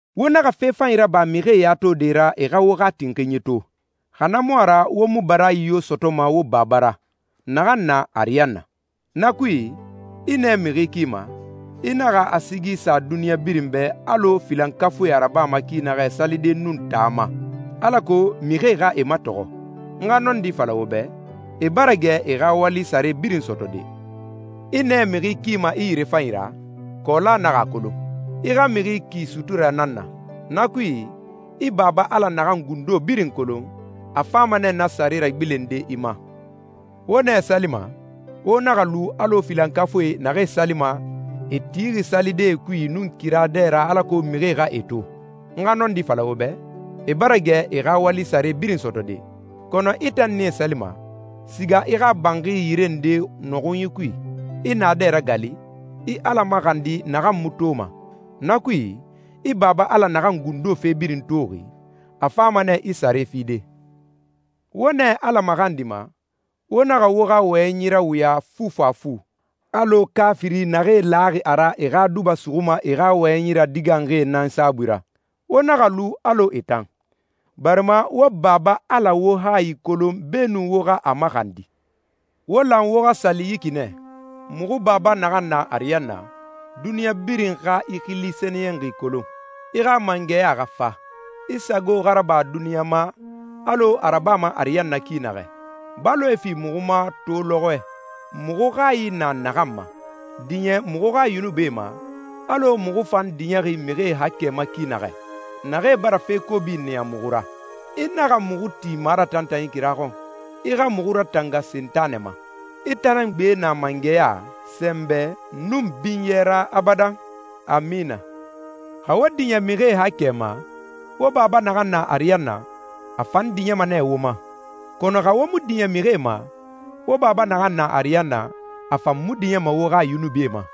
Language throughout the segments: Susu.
«Wo naxa fe fanyi raba mixie ya tode ra e xa wo xa tinxinyi to, xa na mu a ra wo mu baraayi yo sɔtɔma wo Baba ra, naxan na ariyanna. Na kui, i nɛ mixi kima, i naxa a sigi sa duniɲa birin bɛ alɔ filankafuie a rabama ki naxɛ salide nun taa ma, alako mixie xa e matɔxɔ. N xa nɔndi fala wo bɛ, e bara gɛ e xa wali sare birin sɔtɔde. I nɛ mixi kima i yirefanyi ra, kɔɔla naxa a kolon. I xa mixi ki suturɛ nan na. Na kui, i Baba Ala naxan gundo birin kolon, a fama nɛ na sare ragbilende i ma.» «Wo nɛ salima, wo naxa lu alɔ filankafuie naxee salima, e tixi salidee kui nun kira dɛ ra alako mixie xa e to. N xa nɔndi fala wo bɛ, e bara gɛ e xa wali sare birin sɔtɔde. Kɔnɔ i tan nɛ salima, siga i xa banxi yire nde nɔxunyi kui, i naadɛ ragali, i Ala maxandi naxan mu toma. Na kui, i Baba Ala naxan gundo fe birin toxi, a fama nɛ i sare fide.» «Wo nɛ Ala maxandima, wo naxa wo xa wɔyɛnyi rawuya fufafu, alɔ kaafiri naxee laxi a ra a e xa duba suxuma e xa wɔyɛnyi radiganxie nan saabui ra. Wo naxa lu alɔ e tan, barima wo Baba Ala wo hayi kolon beenun wo xa a maxandi.» «Wo lan wo xa sali yi ki nɛ: ‹Muxu Baba naxan na ariyanna, duniɲa birin xa i xili sɛniyɛnxi kolon. I xa mangɛya xa fa. I sago xa raba duniɲa ma, alɔ a rabama ariyanna ki naxɛ. Baloe fi muxu ma to lɔxɔɛ, muxu hayi na naxan ma. Diɲɛ muxu xa yunubie ma, alɔ muxu fan diɲɛxi mixie haakɛe ma ki naxɛ, naxee bara fe kobi niya muxu ra. I naxa muxu ti maratantanyi kira xɔn, i xa muxu ratanga Sentanɛ ma. I tan nan gbe na mangɛya, sɛnbɛ, nun binyɛ ra abadan. Amina.›» «Xa wo diɲɛ mixie haakɛe ma, wo Baba naxan na ariyanna, a fan diɲɛma nɛ wo ma, kɔnɔ xa wo mu diɲɛ mixie ma, wo Baba naxan na ariyanna, a fan mu diɲɛma wo xa yunubie ma.»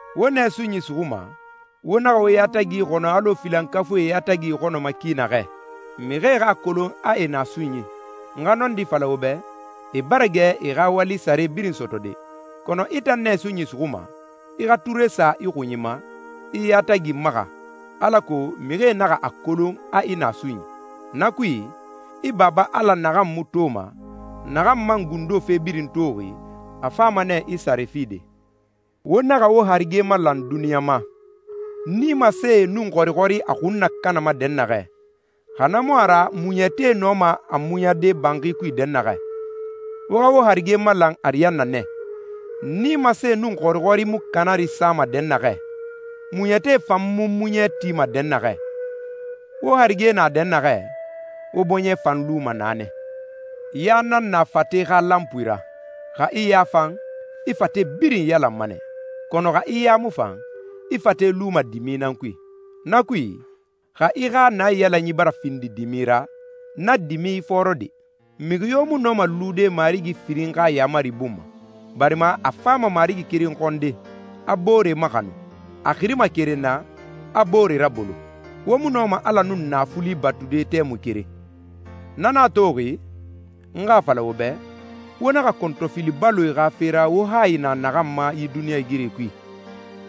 «Wo nɛ sunyi suxuma, wo naxa wo yatagi ixɔnɔ alɔ filankafuie e yatagi ixɔnɔma ki naxɛ, mixie xa a kolon a e na sunyi. N xa nɔndi fala wo bɛ, e bara gɛ e xa wali sare birin sɔtɔde. Kɔnɔ i tan nɛ sunyi suxuma, i xa ture sa i xunyi ma, i i yatagi maxa, alako mixie naxa a kolon a i na sunyi. Na kui, i Baba Ala naxan mu toma, naxan man gundo fe birin toxi, a fama nɛ i sare fide.» «Wo naxa wo harige malan duniɲa ma, nimasee nun xɔrixɔri a xun nakanama dɛnnaxɛ, xa na mu a ra muɲɛtie nɔma a muɲade banxi kui dɛnnaxɛ. Wo xa wo harige malan ariyanna nɛ, nimasee nun xɔrixɔri mu kanari sama dɛnnaxɛ, muɲɛtie fan mu muɲɛ tima dɛnnaxɛ. Wo harige na dɛnnaxɛ, wo bɔɲɛ fan luma naa nɛ.» «Ya nan na fate xa lanpui ra. Xa i ya fan, i fate birin iyalanma nɛ, kɔnɔ xa i ya mu fan, i fate luma dimi nan kui. Na kui, xa i xa naiyalanyi bara findi dimi ra, na dimi ifɔɔrɔ de!» «Mixi yo mu nɔma lude marigi firin xa yaamari bun ma, barima a fama marigi keren xɔnde, a boore maxanu. A xirima keren na, a boore rabolo. Wo mu nɔma Ala nun naafuli batude tɛmui keren.» «Na nan a toxi, n xa a fala wo bɛ, wo naxa kɔntɔfili baloe xa fe ra wo hayi na naxan ma yi duniɲɛigiri kui,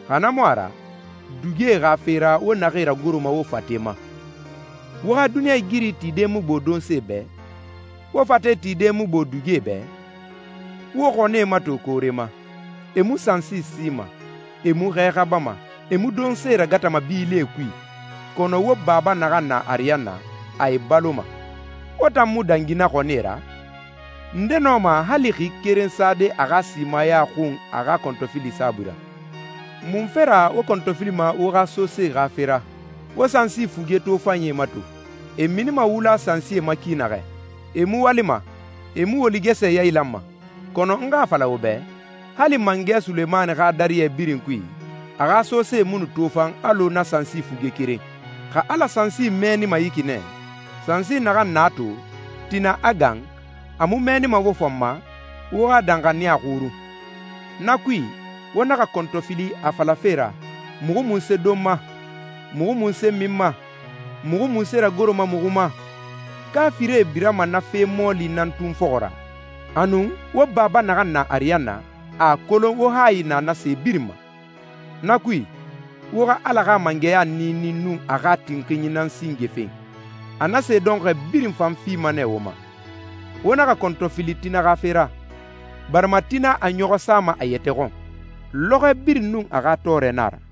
xa na mu a ra, dugie xa fe ra wo naxee ragoroma wo fate ma. Wo xa duniɲɛigiri tide mu gbo donse bɛ? Wo fate tide mu gbo dugie bɛ? Wo xɔnie mato koore ma. E mu sansi sima, e mu xɛ xabama, e mu donse ragatama bilie kui, kɔnɔ wo Baba naxan na ariyanna, a e baloma. Wo tan mu dangi na xɔnie ra? Nde nɔma hali xi keren sade a xa simaya xun a xa kɔntɔfili saabui ra? Munfe ra wo kɔntɔfilima wo xa sosee xa fe ra? Wo sansi fuge tofanyie mato, e minima wula sansie ma ki naxɛ. E mu walima, e mu woligɛsɛ yailanma, kɔnɔ n xa a fala wo bɛ, hali mangɛ Sulemani xa dariyɛ birin kui, a xa sosee mu nu tofan alɔ na sansi fuge keren. Xa Ala sansi mɛɛnima yi ki nɛ, sansi naxan na na to, tina a gan, a mu mɛɛnima wo fan ma? Wo xa danxaniya xurun!» «Na kui, wo naxa kɔntɔfili a falafe ra, ‹Muxu munse donma? Muxu munse minma? Muxu munse ragoroma muxu ma?› Kaafirie birama na fe mɔɔli nan tun fɔxɔ ra. Anun, wo Baba naxan na ariyanna, a a kolon wo hayi na na se birin ma. Na kui, wo xa Ala xa mangɛya niini nun a xa tinxinyi nan singe fen, a na se dɔnxɔɛ birin fan fima nɛ wo ma. Wo naxa kɔntɔfili tina xa fe ra, barima tina a ɲɔxɔ sama a yɛtɛ xɔn. Lɔxɔɛ birin nun a xa tɔɔrɛ nan a ra.»